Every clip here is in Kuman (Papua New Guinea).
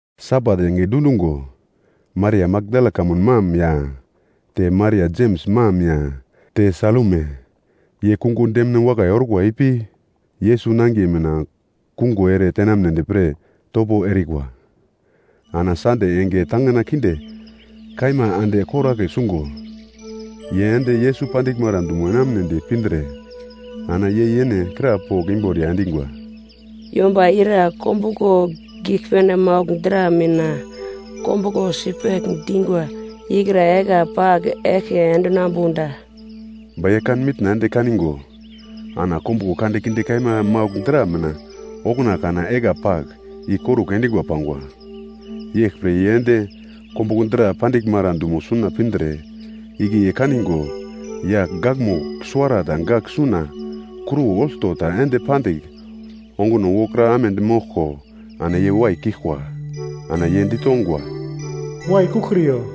Sabat enge dundungo, Maria Makdala kamun mam ya, te Maria Jems mam ya, te Salume ye kungo demine wakai orkwa ipi, Yesus nangiye mina kungo ere tenamnedi pre topo erikwa. Ana Sande enge tangina kinde kaima ande koragle sungo, ye ende Yesus pandiglmara dumo enamunedi pindre, ana ye yene krapogl imboriya endingwa, “Yomba ira kombuglo giglpene maugl dra mina kombuglo sipegl dingwa ikra egla pagl eglke endinambu da?” Ba ye kan mitna ende kaningo, ana kombuglo kandekinde kaima maugl dra mina okuna kana egla pagl ikorugl endingwa pangwa. Yeglpre ye ende kombuglo dra pandiglmara dumo suna pindre, igle ye kaningo yagl gakmugl suwarata gagl suna kruwo olto ta ende pandigl onguno wokra amedi moglko, ana ye waikiglkwa. Ana ye ditongwa, “Waikuglkriyo,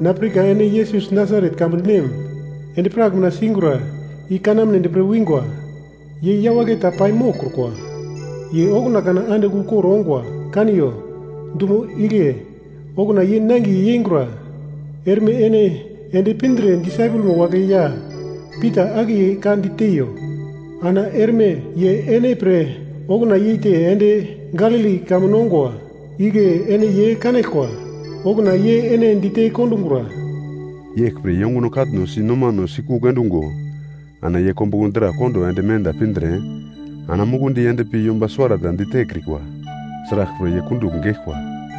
na pirka ene Yesus Nasaret kamun nem endi-prak mina singura i kanamnedi pre wingwa. Ye yawagle ta pai moglkrukwa. Ye okuna kana andigl ukor ongwa! Kaniyo, dumo igle okuna ye nangiye yengura. Erme ene ende pindre disaipelmo wagle ya Pita akiye ka diteiyo. Ana erme ye ene pre okuna yeite ende Galili kamun ongwa. Igle ene ye kanaglkwa. Okuna ye ene dite kondungura.” Yeglpre ye onguno katno si nomano sikugl endungo ana ye kombuglo dra kondo ende menda pindre, ana mukundi endpi yomba suwara ta ditekrikwa. Sraglpre ye kundugl geglkwa.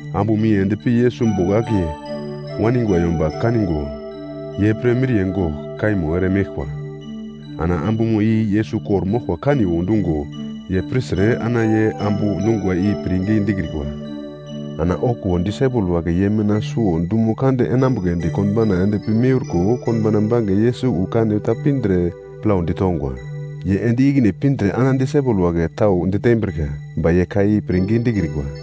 Ambumo i ende pi Yesus bogl akiye waningwa yomba kango, ye pre miriye gogl kaimo ere meglkwa. Ana ambumo i Yesus kor-moglko kaniwo dungo ye pirtre ana ye ambu dungwa i pirngi dikrikwa. Ana okuwo disaipel wagle ye mina suwo dumo kande enambugledi, konbauna ende pi miurko, konbauna bange Yesus wu kane ta pindre plaudi tongwa. Ye ende ikine pindre ana disaipel wagle tau ditembrika. Ba ye ka i pirngi dikrikwa.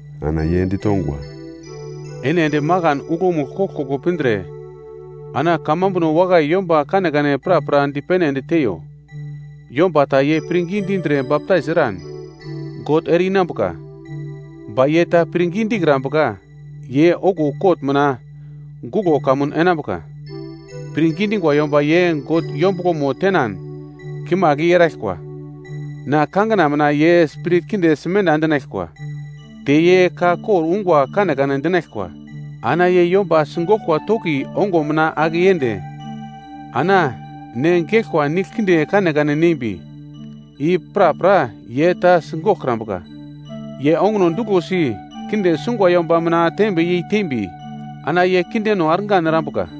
Ana ye ditongwa, “Ene ende makan uglomugl koglkoglo pindre ana kamambuno wakai yomba kanekane prapra dipene ende teiyo. Yomba ta ye pirngi dindre baptais eran, God ere-inambuka. Ba ye ta pirngi dikrambuka ye okuwo kot mina guglo kamun enambuka. Pirngi dingwa yomba ye God yombuglomo tenan kimagl i eraglkwa. Na kangina mina ye spirit kinde simenda endinaglkwa. Te ye ka kor ungwa kanekane dinaglkwa. Ana ye yomba sigoglkwa toki onguno mina ake yende, ana ne geglkwa nigl kinde kanekane nembi, i prapra ye ta sigoglkrambuka. Ye onguno duglosi kinde sungwa yomba mina tembe yei tembi ana ye kindeno argan erambuka.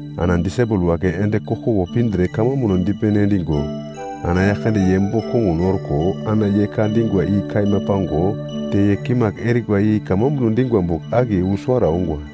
Ana disaipel wagle ende koglkoglo pindre kamambuno dipene endingo ana Yaglkande ye bogl kongun orko ana ye ka dingwa i kaima pango te ye kimagl erikwa i kamambuno dingwa bogl akiye wu suwara ongwa.